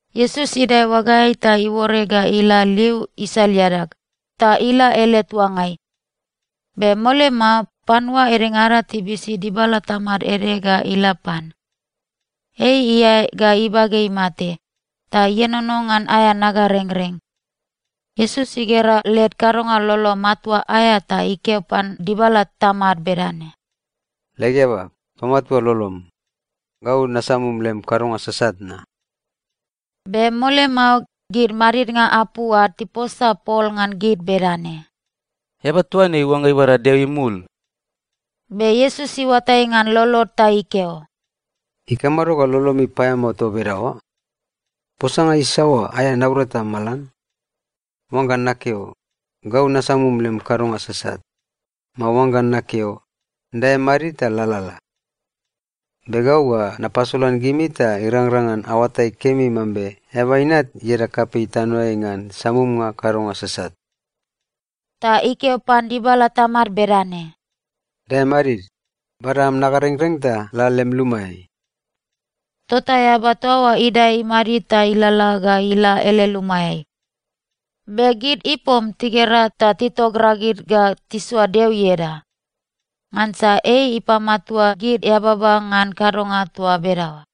Iesus idae oagaeai ta iuore ga ila liu isal iadag, ta ila ele tuangai. Be mole mao, panua edengada tibisi dibala tamad ede ga ila pan. Ei iae ga ibage imate, ta ienono ngan aea nagarengreng. Iesus igera led kadonga lolo matua aea ta ikeo pan dibala tamad bedane, “Leg eaba, pamatua lolom. Gau nasamum lem kadonga sasat na.” Be mole mao, gid madidnga apu ad tiposa pol ngan gid bedane, “Eaba toa ne iuangga ibada Deo imul!” Be Iesus iuatai ngan lolod ta ikeo, “Ikamado ga lolomi paeamao toa bedaoa? Posanga isaoa aea naurata malan: oangga nakeo, ‘Gau nasamum lem kadonga sasat,’ mao oangga nakeo, ‘Dae madid ta lalala’? Be gau ga napasolan gimi ta irangrang ngan aoatai kemi mambe Eaba Inat ieda kapei tanoeai ngan samumnga kadonga sasat.” Ta ikeo pan dibala tamad bedane, “Dae madid. Bada am nagarengreng ta la lem lumaeai.” Tota eaba toa oa idae imadid ta ilalala ga ila ele lumaeai. Be gid ipom tigera ta titogragid ga tisoa Deo ieda. Ngansa ei ipamatua gid eababa ngan kadonga toa bedaoa.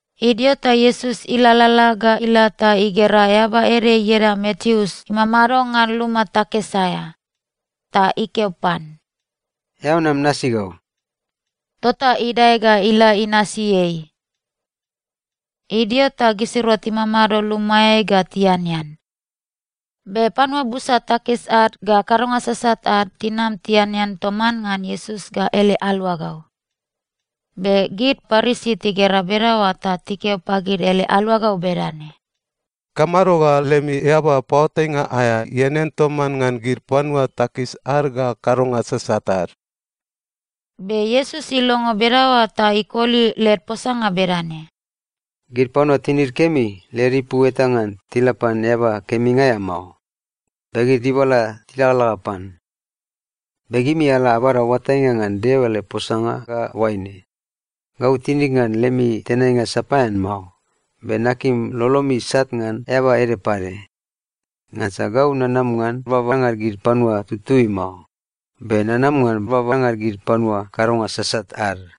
Idio ta Iesus ilalala ga ila ta igera eaba ede ieda Mateus imamado ngan luma takis aea. Ta ikeo pan, “Eao nam nasi gau.” Tota idae ga ila inasi ei. Idio ta gisirua timamado lumaeai ga tianean. Be panua busa takis ad ga kadonga sasat ad tinam tianean toman ngan Iesus ga ele aluagau. Be gid Parisi tigera bedaoa ta tikeo pagid ele aluagau bedane, “Ikamado ga lemi eaba paoatainga aea ianean toman ngan gid panua takis ad ga kadonga sasat ad?” Be Iesus ilongo bedaoa ta ikoli led posanga bedane, “Gid panua tinid kemi, led ipu eta ngan tila pan eaba keminga aea mao, be gid dibala tilagalaga pan. Be gimi ala abada oatainga ngan Deo ele posanga ga oaine: ‘Gau tinig ngan lemi tenainga sapaean mao. Be nakim lolomi isat ngan eaba ede pade.’ Ngansa gau nanam ngan babanga gid panua tututui mao, be nanam ngan babanga gid panua kadonga sasat ad.”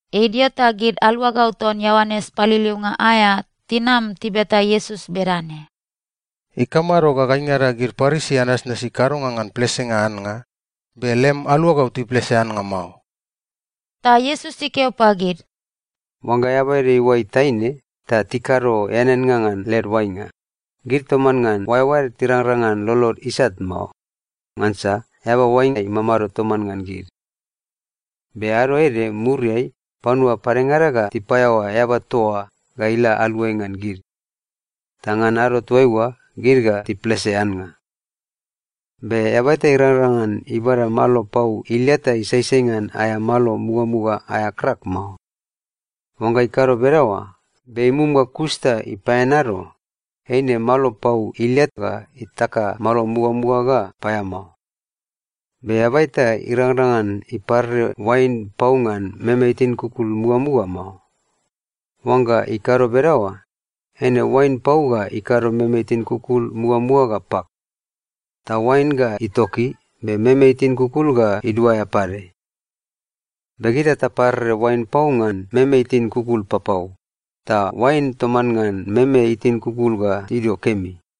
Idio ta gid aluagau ton Ioanes Paliliunga aea tinam tibeta Iesus bedane, “Ikamado ga gaingada gid Parisi anasnasi kadonga ngan plesenga annga, be lem aluagau tiplese annga mao?” Ta Iesus ikeo pagid, “Oangga eaba ede iuai taine, ta tikado eaneannga ngan led oainga, gid toman ngan oaeoaed tirangrang ngan lolod isat mao, ngansa eaba oainga imamado toman ngan gid. Be ado ede muriai, panua padengada ga tipaeaoa eaba toa oa ga ila aluai ngan gid. Ta ngan ado toaiua, gid ga tiplese annga. “Be eaba eta irangrang ngan ibada malo pau ilia ta isaisai ngan aea malo mugamuga aea krak mao. Oangga ikado bedaoa, be imum ga kus ta ipaeanado, eine malo pau ilia ga itaka malo mugamuga ga paeamao. Be eaba eta irangrang ngan iparere oain pau ngan meme itin kukul mugamuga mao. Oangga ikado bedaoa, eine oain pau ga ikado meme itin kukul mugamuga ga pak. Ta oain ga itoki, be meme itin kukul ga iduaea pade. Be gita taparere oain pau ngan meme itin kukul papau, ta oain toman ngan meme itin kukul ga tidio kemi.”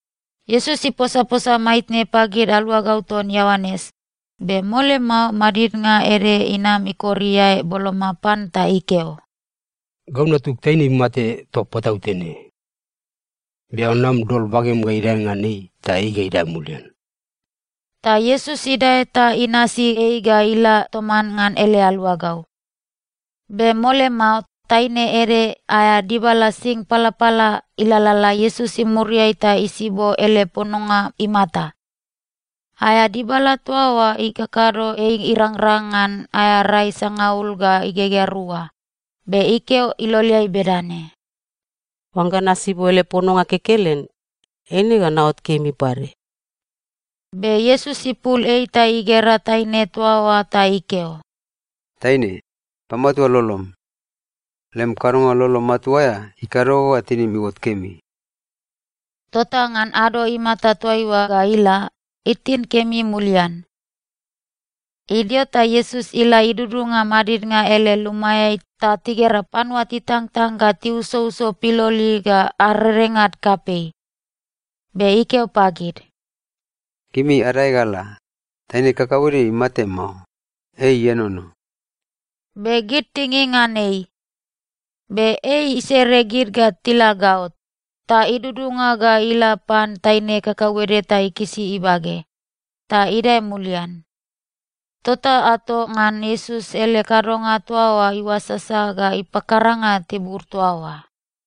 Iesus iposaposa maitne pagid aluagau ton Ioanes, be mole mao madidnga ede inam ikor iae boloma pan ta ikeo, “Gau natug taine imate toa patautene. Be eao nam dol bagem ga idae ngan ei, ta ei ga idae mulian.” Ta Iesus idae ta inasi ei ga ila toman ngan ele aluagau. Be mole mao, taine ede aea dibala sing palapala ilalala Iesus imuriai ta isibo ele pononga imata. Aea dibala toa oa ikakado ei irangrang ngan aea rai sangaul ga igegea rua, be ikeo iloleai bedane, “Oangga nasibo ele pononga kekelen, eine ga naot kemi pade.” Be Iesus ipul ei ta igera taine toa oa ta ikeo, “Taine, pamatua lolom. Lem kadonga lolo matua aea ikado ga tinim iuot kemi.” Tota ngan ado imata toaiua ga ila, itin kemi mulian. Idio ta Iesus ila idudunga madidnga ele lumaeai ta tigera panua titangtang ga tiusouso piloli ga arerengad kapei. Be ikeo pagid, “Gimi adae ga ala. Taine kakauede imate mao. Ei ienono.” Be gid tinging ngan ei. Be ei isere gid ga tila gaot, ta idudunga ga ila pan taine kakauede ta ikisi ibage. Ta idae mulian. Tota ato ngan Iesus ele kadonga toa oa iuasasa ga ipakaranga tibur toa oa.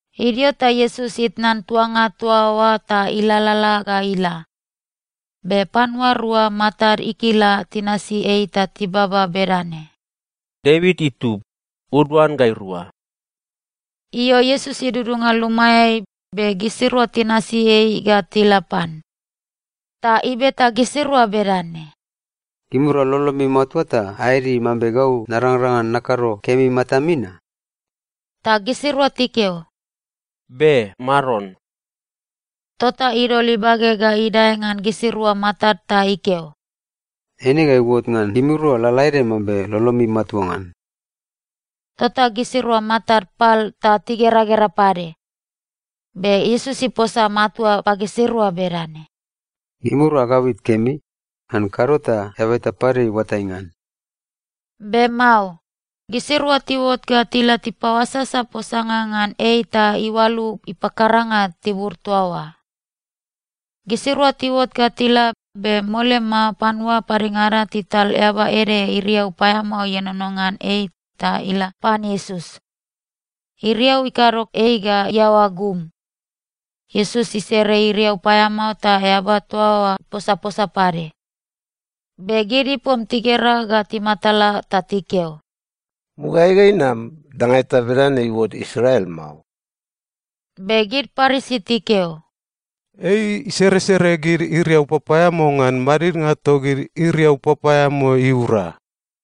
Idio ta Iesus itnan tuanga toa oa ta ilalala ga ila. Be panua rua matad ikila tinasi ei ta tibaba bedane, “Devit itub, uduan gairua.” Io, Iesus idudunga lumaeai, be gisirua tinasi ei ga tila pan. Ta ibeta gisirua bedane, “Gimirua lolomi matua ta aeadi mambe gau narangrang ngan nakado kemi matami na?” Ta gisirua tikeo, “Be, Maron.” Tota idol ibage ga idae ngan gisirua matad ta ikeo, “Eine ga iuot ngan gimirua lalaede mambe lolomi matua ngan.” Tota gisirua matad pal ta tigeragera pade. Be Iesus iposa matua pagisirua bedane, “Gimirua agabit kemi. Ngan kado ta eaba eta pade iuatai ngan.” Be mao. Gisirua tiuot ga tila tipaoasasa posanga ngan ei ta iualu ipakaranga tibur toa oa. Gisirua tiuot ga tila, be mole mao panua padengada tital eaba ede iriau paeamao ienono ngan ei ta ila pan Iesus. Iriau ikado ei ga iaoa gum. Iesus isere iriau paeamao ta eaba toa oa iposaposa pade. Be gid ipom tigera ga timatala ta tikeo, “Mugaeai ga inam, danga eta bedane iuot Israel mao.” Be gid Parisi tikeo, “Ei iseresere gid iriau papaeamao ngan madidnga togid iriau papaeamao iura.”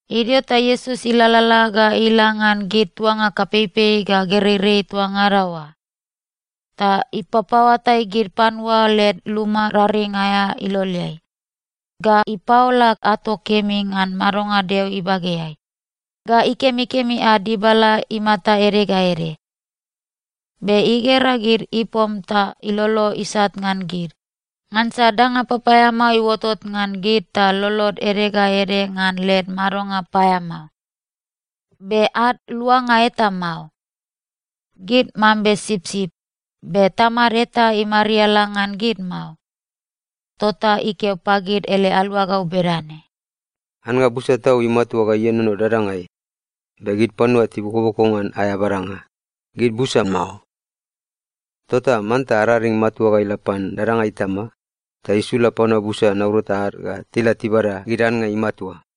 Idio ta Iesus ilalala ga ila ngan gid tuanga kapeipei ga gereirei toa ngada oa. Ta ipapaoatai gid panua led luma raring aea iloleai, ga ipaola ato kemi ngan madonga Deo ibageai, ga ikemikemi ad dibala imata ede ga ede. Be igera gid ipom ta ilolo isat ngan gid, ngansa danga papaeamao iuotot ngan gid ta lolod ede ga ede ngan led madonga paeamao, be ad luanga eta mao. Gid mambe sipsip, be tamad eta imariala ngan gid mao. Tota ikeo pagid ele aluagau bedane, “Annga busa tau imatua ga ienono dadangai, be gid panua tibokoboko ngan aea badanga, gid busa mao. Tota manta araring matua ga ila pan dadanga Itama, ta isula panua busa naurata ad ga tila tibada gid annga imatua.”